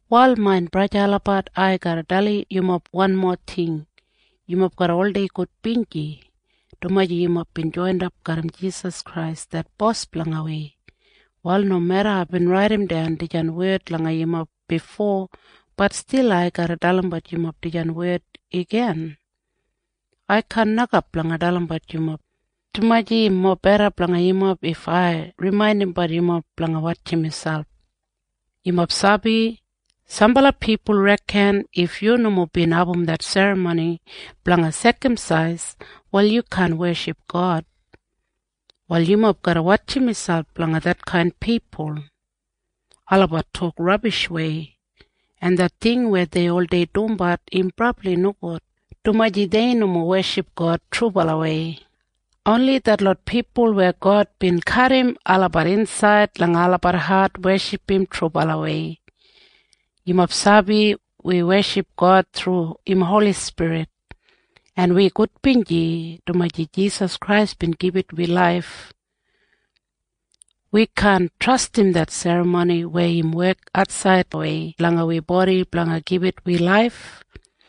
Wal main braja en sista olabat, ai garra dalim yumob wanmo ting. Yumob garra oldei gudbinji, dumaji yumob bin joinap garram Jisas Krais det Bos blanga wi. Wal nomeda aibin raidimdan dijan wed langa yumob bifo, bat stil ai garra dalimbat yumob dijan wed igin. Ai kaan nokap blanga dalimbat yumob, dumaji im mobeda blanga yumob if ai rimaindimbat yumob blanga wotjim miselp. Yumob sabi? Sambala pipul reken if yu nomo bin abum det serramoni blanga sekamsais, wal yu kaan weship God. Wal yumob garra wotjim miselp blanga detkain pipul. Olabat tok rabishwei! En det ting weya dei oldei dumbat im brabli nogud, dumaji dei nomo weship God trubalawei. Oni detlot pipul weya God bin kadim olabat insaid langa olabat hat, weship im trubalawei. Yumob sabi? Wi weship God thru im Holi Spirit, en wi gudbinji, dumaji Jisas Krais bin gibit wi laif. Wi kaan trastim det serramoni weya im wek atsaidwei langa wi bodi blanga gibit wi laif.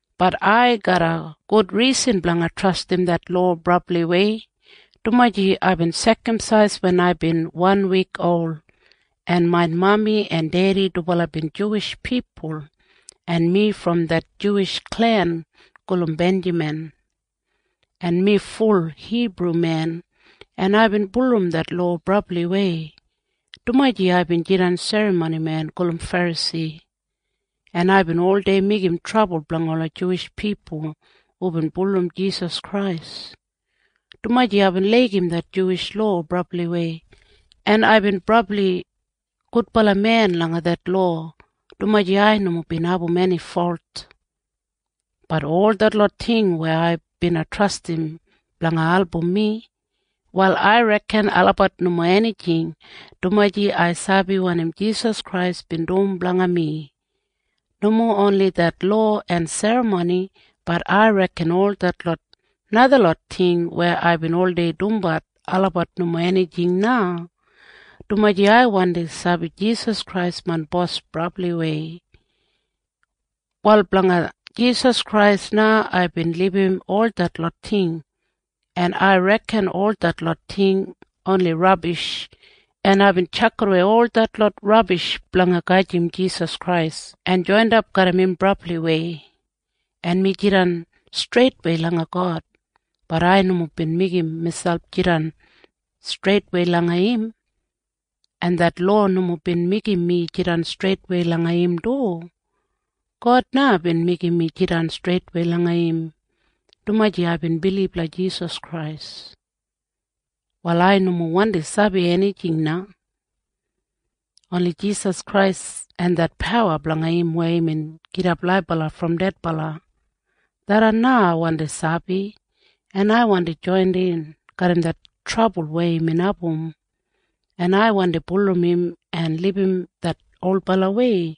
Bat ai garram gud risan blanga trastim det lowa brabliwei, dumaji aibin sekamsais wen aibin wanwik ol, en main mami en dedi dubala bin Juwish pipul, en mi brom det Juwish klen gulum Benjamin, en mi ful Hibrumen, en aibin bulurrum det lowa brabliwei, dumaji aibin jidan serramonimen gulum Ferasi, en aibin oldei meigim trabul blanga ola Juwish pipul hubin bulurrum Jisas Krais, dumaji aibin laigim det Juwish lowa brabli, en aibin brabli gudbala men langa det lowa, dumaji ai nomo bin abum eni folt. Bat ol detlot ting weya ai bina trastim blanga album mi, wal ai reken olabat nomo enijing, dumaji ai sabi wanim Jisas Krais bin dum blanga mi. Nomo oni det lowa en serramoni, bat ai reken ol detlot najalot ting weya aibin oldei dumbat olabat nomo enijing na, dumaji ai wandi sabi Jisas Krais main Bos brabliwei. Wal blanga Jisas Krais na aibin libum ol detlot ting, en ai reken ol detlot ting oni rabish, en aibin tjakidawei ol detlot rabish blanga gedim Jisas Krais en joinap garram im brabliwei. En mi jidan streitwei langa God. Bat ai nomo bin meigim miselp jidan streitwei langa im. En det lowa nomo bin meigim mi jidan streitwei langa im du. God na bin meigim mi jidan streitwei langa im, dumaji aibin bilib langa Jisas Krais. Wal ai nomo wandi sabi enijing na. Oni Jisas Krais en det pawa blanga im weya imbin gidap laibala brom dedbala. Tharran na ai wandi sabi, en ai wandi joinin garram det trabul weya imbin abum, en ai wandi bulurrum im en libum det olbalawei,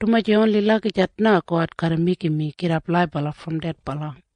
dumaji oni lagijat na God garra meigim mi gidap laibala brom dedbala.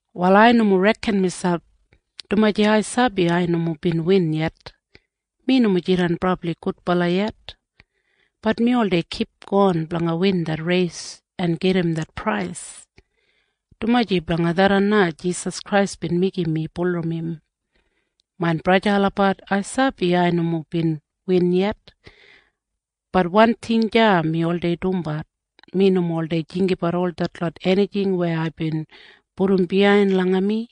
Wal ai nomo reken miselp, dumaji ai sabi ai nomo bin win yet. Mi nomo jidan brabli gudbala yet. Bat mi oldei kipgon blanga win det reis en gedim det prais, dumaji blanga tharran na Jisas Krais bin meigim mi bulurrum im. Main braja en sista olabat, ai sabi ai nomo bin win yet. Bat wan ting deya mi oldei dumbat. Mi nomo oldei jinggabat ol detlot enijing weya aibin pudum biyain langa mi.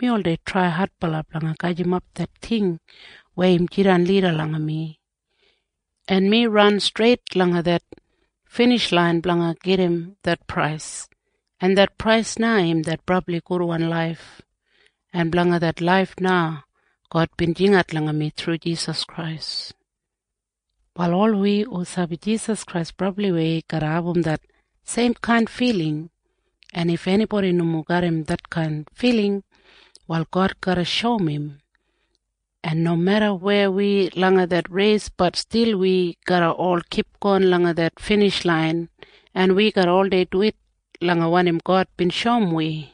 Mi oldei trai adbala blanga gajimap det ting weya im jidan lida langa mi, en mi ran streit langa det binijlain blanga gedim det prais, en det prais na im det brabli gudwan laif, en blanga det laif na God bin jingat langa mi thru Jisas Krais. Wal ol wi hu sabi Jisas Krais brabliwei garra abum det seimkain filing. En if enibodi nomo garram detkain filing, wal God garra shoum im. En nomeda weya wi langa det reis, bat stil wi garra ol kipgon langa det binijlain, en wi garra oldei duwit langa wanim God bin shoum wi.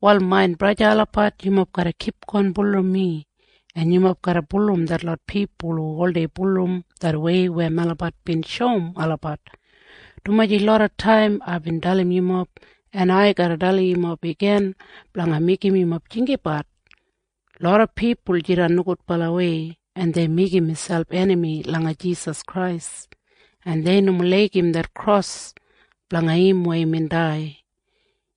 Wal main braja en sista olabat, yumob garra kipgon bulurrum mi, en yumob garra bulurrum detlot pipul hu oldei bulurrum det wei weya melabat bin shoum olabat, dumaji loda taim aibin dalim yumob, en ai garra dalimbat yumob igin blanga meigim yumob jinggabat. Loda pipul jidan nogudbalawei, en dei meigim miselp enami langa Jisas Krais, en dei nomo laigim det kros blanga im weya imbin dai.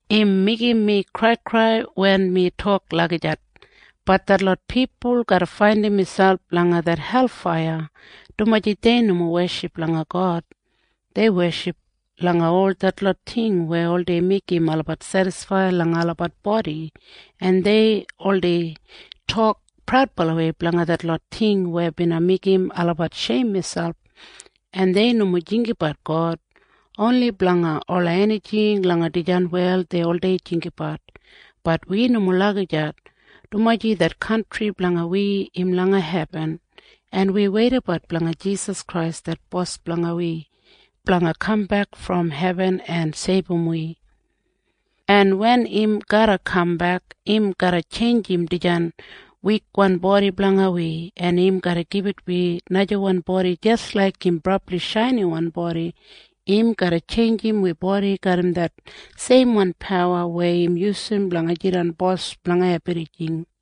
Im meigim mi kraikrai wen mi tok lagijat, bat detlot pipul garra faindim miselp langa det helfaiya, dumaji dei nomo weship langa God. Dei weship langa ol detlot ting weya oldei meigim olabat sedisfaid langa olabat bodi, en dei oldei tok praudbalawei blanga detlot ting weya bina meigim olabat sheim miselp, en dei nomo jinggabat God. Oni blanga ola enijing langa dijan wel dei oldei jinggabat. Bat wi nomo lagijat, dumaji det kantri blanga wi im langa hebin, en wi weidabat blanga Jisas Krais det Bos blanga wi blanga kambek brom hebin en seibum wi, en wen im garra kambek, im garra tjeinjim dijan wikwan bodi blanga wi, en im garra gibit wi najawan bodi jis laik im brabli shainiwan bodi. Im garra tjeinjim wi bodi garram det seimwan pawa weya im yusum blanga jidan Bos blanga ebrijing.